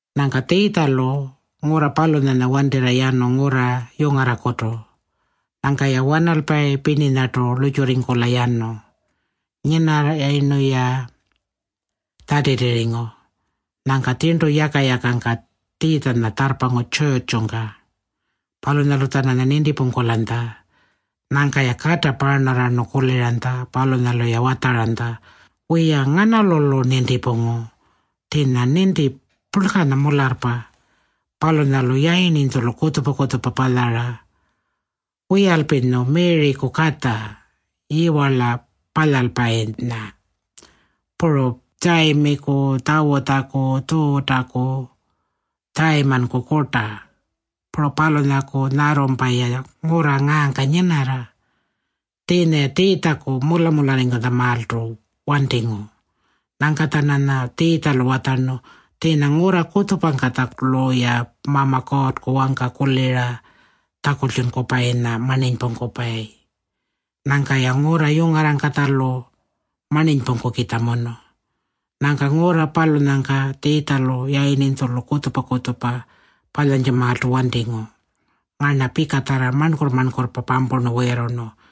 Nyangka Tjiitjalu ngurra palunyanya wantirra yanu ngurra yungarrakutu. Nyangka-ya wanalpayi pirninyatarrartu lurrtjurringkula yanu. Nyinarrayirnu-ya Tjatitirringu. Nyangka tjirntu yaka-yakangka Tjiitjanya tjarrpangu tjurrtjungka. Palunyalu-tjananya nintipungkulanytja. Nyangka-ya kata paarnarrarnu kuliranytja. Palunyalu-ya watjaranytja, “Wiya, nganalu-lu nintipungu? Tjiinya ninti purlkanya mularrpa. Palunyalu yayirninytjulu kutjupa-kutjupa palyara. Wiyalpinyu Miriku katja, yiwarla palyalpayinya? Puru Tjayimiku, Tjawutjaku, Tjuutaku, Tjayimanku kurta. Puru palunyaku nyarrumpa-ya ngurra ngaangka nyinarra.” Tjiinya-ya Tjiitjaku mula-mularringkutjamaaltu wantingu. Nyangka-tjananya Tjiitjalu watjarnu, “Tjiinya ngurra kutjupangkatjalu-ya Mama Kuurrku wangka kulira tjakultjunkupayinya marninypungkupayi. Nyangka-ya ngurra yungarrangkatjalu marninypungkukitjamunu.” Nyangka ngurra palunyangka Tjiitjalu yayirninytjulu kutjupa-kutjupa palyantjamaaltu wantingu. Ngarna pikatjarra marnkurr-marnkurrpa pampurnu wiirrurnu.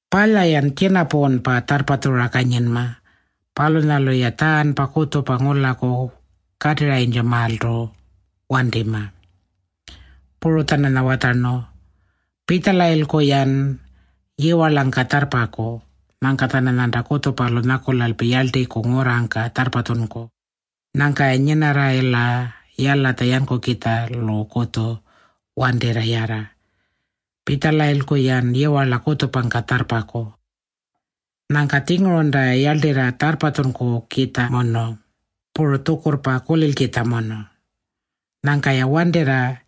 Palya-yan tjinapuunpa tjarrpatjura kanyinma. Palunyalu-ya tjaarnpa kutjupa ngulaku katirranytjamaaltu wantima.” Puru-tjananya watjarnu, “Pitjalayilku-yan yiwarlangka tjarrpaku. Nyangka-tjananyanta kutjupalu nyakulalpi yarltiku ngurrangka tjarrpatjunku. Nyangka-ya nyinarrayila yalatja yankukitjalukutju wantirra yarra. Pitjalayilku-yan yiwarla kutjupangka tjarrpaku. Nyangka-tjingurunta-ya yarltirra tjarrpatjunkukitjamunu, puru tjukurrpa kulilkitjamunu. Nyangka-ya wantirra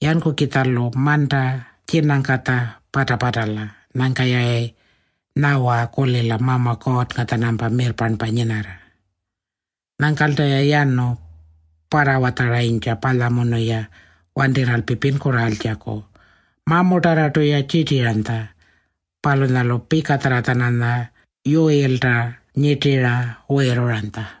yankukitjalu manta tjinangkatja pata-patala. Nyangka-yayi nyawa kulila Mama Kuurrnga-tjanampa mirrparnpa nyinarra.” Nyangkalta-ya yanu parrawatjaranytja palyamunu-ya wantirralpi pinkurraaltjaku. Mamutarrartu-ya tjirtiranytja. Palunyalu pikatjarra-tjananya uyilta nyirtira wiirruranytja.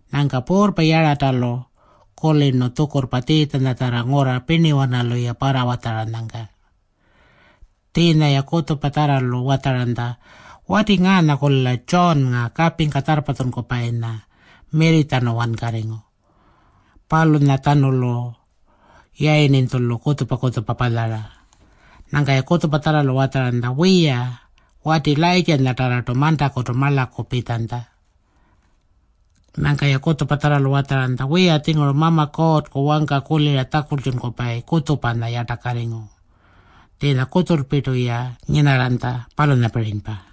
Nyangka puurrpa Yaratalu kulirnu tjukurrpa Tjiitjanyatjarra ngurra pirniwanalu-ya parrawatjaranyangka. Tjiinya-ya kutjupatjarralu watjaranytja, “Wati ngaanya-kulila Tjuunnga kapingka tjarrpatjunkupayinya mirritjanu wankarringu. Palunyatjanulu yayirninytjulu kutjupa-kutjupa palyara.” Nyangka-ya kutjupatjarralu watjaranytja, “Wiya, wati Layirrtjanyatarrartu mantakutu marlaku pitjanytja.” Nyangka-ya kutjupatjarralu watjaranytja, “Wiya-tjinguru Mama Kuurrku wangka kulira tjakultjunkupayi kutjupanya yartakarringu. Tjiinya kutjulpirtulpi-ya nyinarranytja, palunyapirinypa.”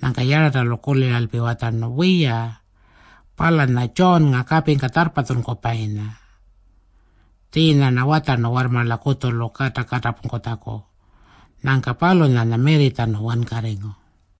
Nyangka Yaratalu kuliralpi watjarnu, “Wiya, palunyanya Tjuunnga kapingka tjarrpatjunkupayinya. Tjiinya-rna watjarnu warrmarla kutjulu kata katapungkutjaku. Nyangka palunyanya mirritjanu wankarringu.”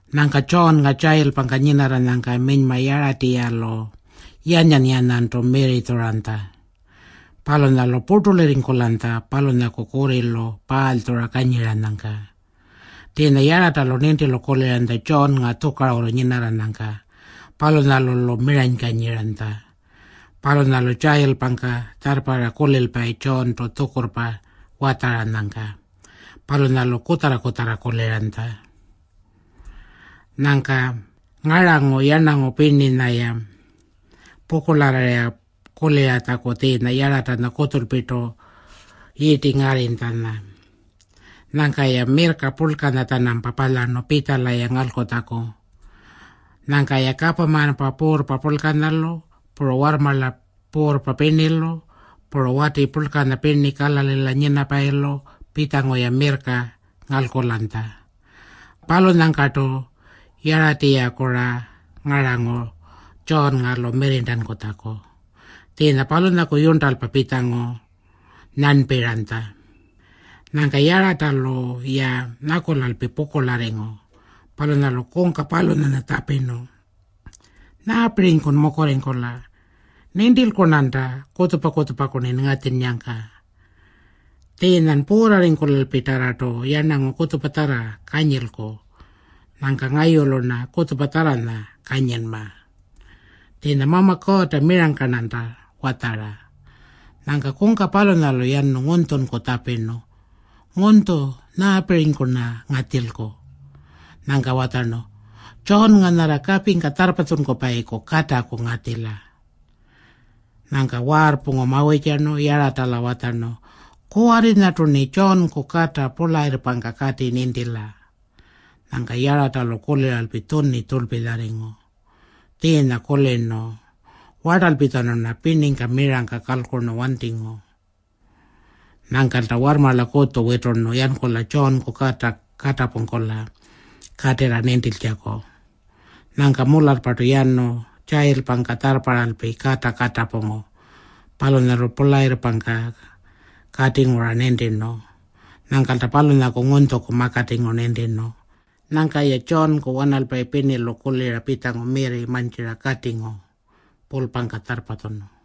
Nyangka Tjuunnga tjayilpangka nyinarranyangka minyma Yaratiyalu yanyan-yanyantu mirritjuranytja. Palunyalu purtulirringkulanytja palunyaku kurrilu paalytjura kanyiranyangka. Tjiinya Yaratalu nintilu kuliranytja Tjuunnga tjukarurru nyinarranyangka. Palunyalu-lu miranykanyiranytja. Palunyalu tjayilpangka tjarrparra kulilpayi Tjuuntu tjukurrpa watjaranyangka. Palunyalu kutjarra-kutjarra kuliranytja. Nyangka ngarangu yarnangu pirninya-ya pukurlarrirra kuliratjaku tjiinya Yaratanya kutjulpirtu yirti ngarrinytjanya. Nyangka-ya mirrka purlkanya-tjanampa palyarnu pitjala-ya ngalkutjaku. Nyangka-ya kapamanpa puurrpa purlkanyalu, puru warrmarla puurrpa pirnilu, puru wati purlkanya pirni Kalalila nyinapayilu pitjangu-ya mirrka ngalkulanytja. Palunyangkartu Yaratiyaku-ra ngarangu Tjuunnga-lu mirrirntankutjaku. Tjiinya palunyaku yurntalpa pitjangu nyarnpirranytja. Nyangka Yaratalu-ya nyakulalpi pukurlarringu. Palunyalu kungka palunyanya tjapirnu, “Nyaapirinykun mukurringkula? Nintilku-rnanta kutjupa-kutjupaku-rnin ngatjinnyangka. Tjiinyan puurrarringkulalpitarrartu yarnangu kutjupatjarra kanyilku. Nyangka ngayulu-rna kutjupatjarranya kanyinma. Tjiinya Mama Kuurrta mirangka-rnanta watjara.” Nyangka kungka palunyalu yanu ngunytjunku tjapirnu, “Ngunytju, nyaapirinyku-rna ngatjilku?” Nyangka watjarnu, “Tjuunnga nyarra kapingka tjarrpatjunkupayiku kataku ngatjila.” Nyangka waarrpungu mawirrtjarnu Yaratala watjarnu, “Kuwarrinyartu-rni Tjuunku kata purlayirrpangka kati nintila.” Nyangka Yaratalu kuliralpi tjuni tjurlpilyarringu. Tjiinya kulirnu, “Wartalpitjanu-rna pirningka mirangka kalkurnu wantingu.” Nyangkalta warrmarla kutju witurnu yankula Tjuunku kata katapungkula katirra nintiltjaku. Nyangka mularrpartu yanu tjayilpangka tjarrparralpi kata katapungu. Palunyalu purlayirrpangka katingu-ra nintirnu. Nyangkalta palunyaku ngunytjuku makatingu nintirnu. Nyangka-ya Tjuunku wanalpayi pirnilu kulira pitjangu mirri mantjira katingu pulpangka tjarrpatjunu.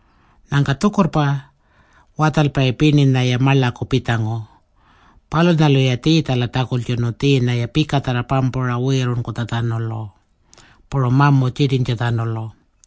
Nyangka tjukurrpa watjalpayi pirninya-ya marlaku pitjangu. Palunyalu-ya Tjiitjala tjakultjunu tjiinya-ya pikatjarra pampura wiirruranytjatjanulu, puru mamu tjirtintjatjanulu.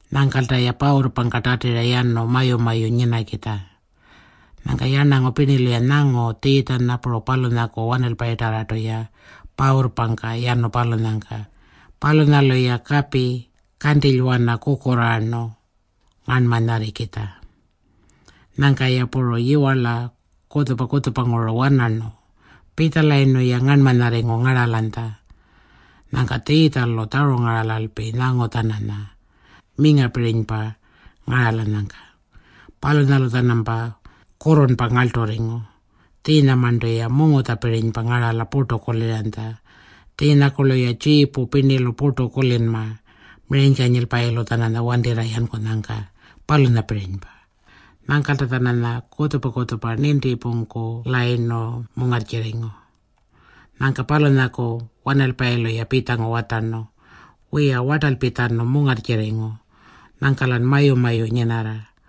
Nyangkalta-ya pawurrpangka tatira yanu mayu-mayu nyinakitja. Nyangka yarnangu pirnilu-ya nyangu Tjiitjanya puru palunyaku wanalpayinyatarrartu-ya pawurrpangka yanu palunyangka. Palunyalu-ya kapi kantilywana kukurraarnu ngarnmanyarrikitja. Nyangka-ya puru yiwarla kutjupa-kutjupanguru wanarnu. Pitjalayirnu-ya, ngarnmanyarringu ngaralanytja. Nyangka Tjiitjalu tjarungaralalpi nyangu-tjananya mingapirinypa ngaralanyangka. Palunyalu-tjanampa kurrurnpa ngarlturringu. Tjiinyamarntu-ya mungutjapirinypa ngarala purtu kuliranytja. Tjiinyakurlu-ya tjiipu pirnilu purtu kulinma miranykanyilpayilu-tjananya wantirra yankunyangka, palunyapirinypa. Nyangkalta-tjananya kutjupa-kutjupa nintipungkulayirnu mungarrtjirringu. Nyangka palunyaku wanalpayilu-ya pitjangu watjarnu, “Wiya, wartalpitjanu mungarrtjirringu. Nyangka-lan mayu-mayu nyinarra.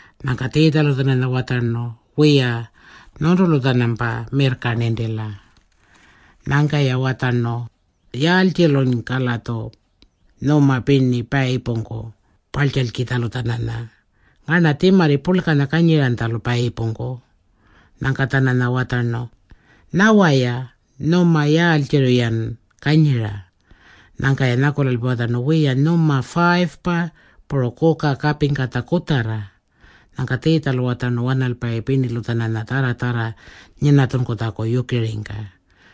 Nyangka Tjiitjalu-tjananya watjarnu, “Wiya, nyuntulu-tjanampa mirrka nintila.” Nyangka-ya watjarnu, “Yaaltjilunyka-latju nyuma pirni payipungku parltjalkitjalu-tjananya? Ngarna tjimarri purlkanya kanyiranytjalu payipungku.” Nyangka-tjananya watjarnu, “Nyawa-ya, ‘Nyuma yaaltjirri-yan kanyira?’” Nyangka-ya nyakulalpi watjarnu, “Wiya, nyuma 5-pa puru kuka kapingkatja kutjarra.” Nyangka Tjiitjalu watjarnu wanalpayi pirnilu-tjananya tjarra-tjarra nyinatjunkutjaku yukiringka.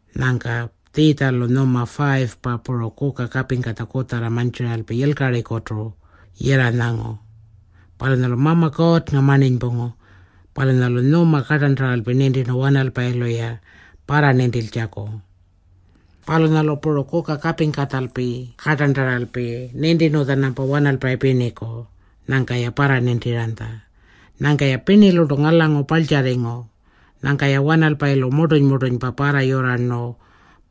Nyangka Tjiitjalu nyuma 5-pa puru kuka kapingkatja kutjarra mantjiralpi yilkarikutu yirranyangu. Palunyalu Mama Kuurrnga marninypungu. Palunyalu nyuma kartarntaralpi nintirnu wanalpayilu-ya parranintiltjaku. Palunyalu puru kuka kapingkatjalpi kartarntaralpi nintirnu-tjanampa wanalpayi pirniku. Nyangka-ya parranintiranytja. Nyangka-ya pirnilurtu ngalangu parltjarringu. Nyangka-ya wanalpayilu murtuny-murtunypa parrayurrarayirnu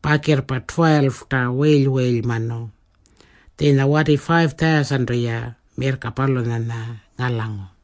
pakirrpa 12-ta wiily-wiilymanu. Tjiinya wati 5,000-tu-ya mirrka palunyanya ngalangu.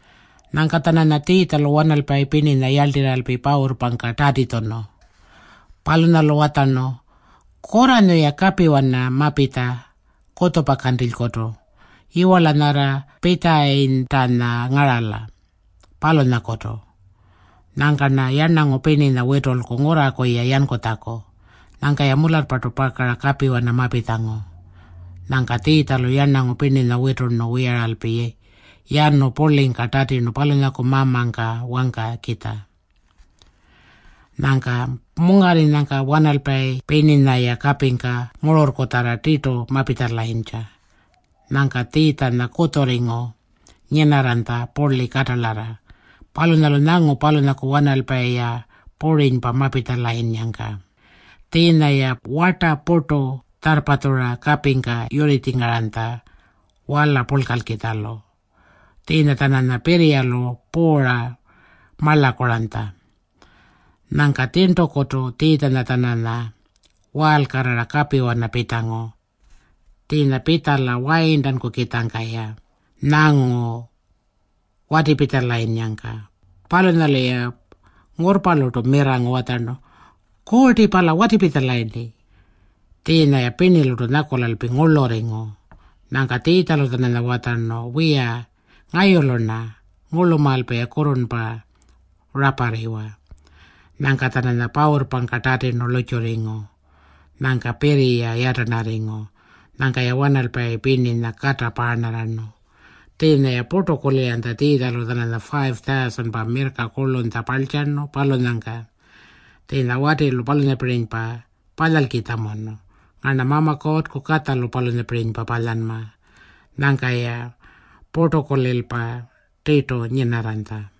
Nyangka-tjananya Tjiitjalu wanalpayi pirninya yarltirralpi pawurrpangka tatitjunu. Palunyalu watjarnu, “Kurranyu-ya kapiwana mapitja kutjupa kantilykutu, yiwarla nyarra Pitjayitanya ngarala, palunyalakutu. Nyangka-rna yarnangu pirninya witulku ngurraku-ya yankutjaku.” Nyangka-ya mularrpartu pakara kapiwana mapitjangu. Nyangka Tjiitjalu yarnangu pirninya witurnu wiyaralpi yanu purlingka tatirnu palunyaku Mamangka wangkakitja. Nyangka mungarringkunyangka wanalpayi pirninya-ya kapingka ngururrkutjarra tirtu mapitjalayintja. Nyangka Tjiitjanya kutjurringu nyinarranytja purli katalarra. Palunyalu nyangu palunyaku wanalpayi-ya purinypa mapitjalayinnyangka. Tjiinya-ya warta purtu tjarrpatjura kapingka yurritjingaranytja wala purlkalkitjalu. Tjiinya-tjananya pirriyalu puura marlakuranytja. Nyangka tjirntukutu Tjiitjanya-tjananya waalkarrara kapiwana pitjangu. Tjiinya pitjala wayirntankukitjangka-ya nyangu watipitjalayinnyangka. Palunyalu-ya ngurrpalurtu mirrangu watjarnu, “Kuurti pala watipitjalayirni.” Tjiinya-ya pirnilurtu nyakulalpi ngurlurringu. Nyangka Tjiitjalu-tjananya watjarnu, “Wiya, ngayulu-rna. Ngurlumaalpa-ya kurrurnpa raparriwa.” Nyangka-tjananya pawurrpangka tatirnu lurrtjurringu. Nyangka pirriya yatarnarringu. Nyangka-ya wanalpayi pirninya kata paarnarrarnu. Tjiinya-ya purtu kuliranytja Tjiitjalu-tjananya 5,000-pa mirrka kurlunytja parltjarnu palunyangka. Tjiinya watilu palunyapirinypa palyalkitjamunu. Ngarna Mama Kuurrku Katjalu palunyapirinypa palyanma. Nyangka-ya purtukulilpa tirtu nyinarranytja.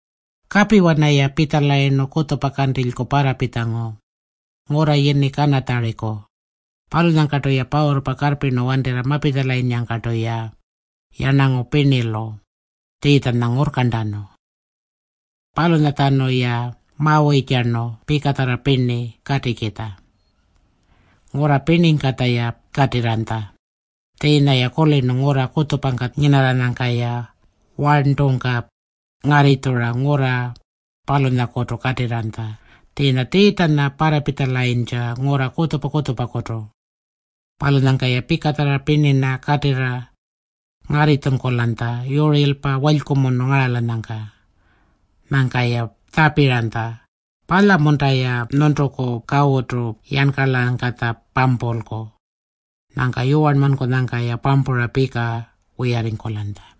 Kapiwana-ya pitjalayirnu kutjupa kantilyku parrapitjangu ngurra yini Kanatjariku. Palunyangkalta-ya pawurrpa karrpirnu wantirra mapitjanyangkartu-ya yarnangu pirnilu Tjiitjanya ngurrkarntanu. Palunyatjanu-ya mawirrtjarnu pikatjarra pirni katikitja. Ngurra pirningkatja-ya katirrayintja. Tjiinya-ya kulirnu ngurra kutjupangka nyinarranyangka-ya warntungka ngarritjura ngurra palunyakutu katirranytja. Tjiinya Tjiitjanya parrapitjalayintja ngurra kutjupa-kutjupakutu. Palunyangka-ya pikatjarra pirninya katirra ngarritjunkulanytja yurirlpa walykumunu ngaralanyangka. Nyangka-ya tjapiranytja, “Palya-munta-ya nyuntuku kawutu yankarlangkatja pampulku?” Nyangka yuwarnmankunyangka-ya pampura pika wiyarringkulanytja.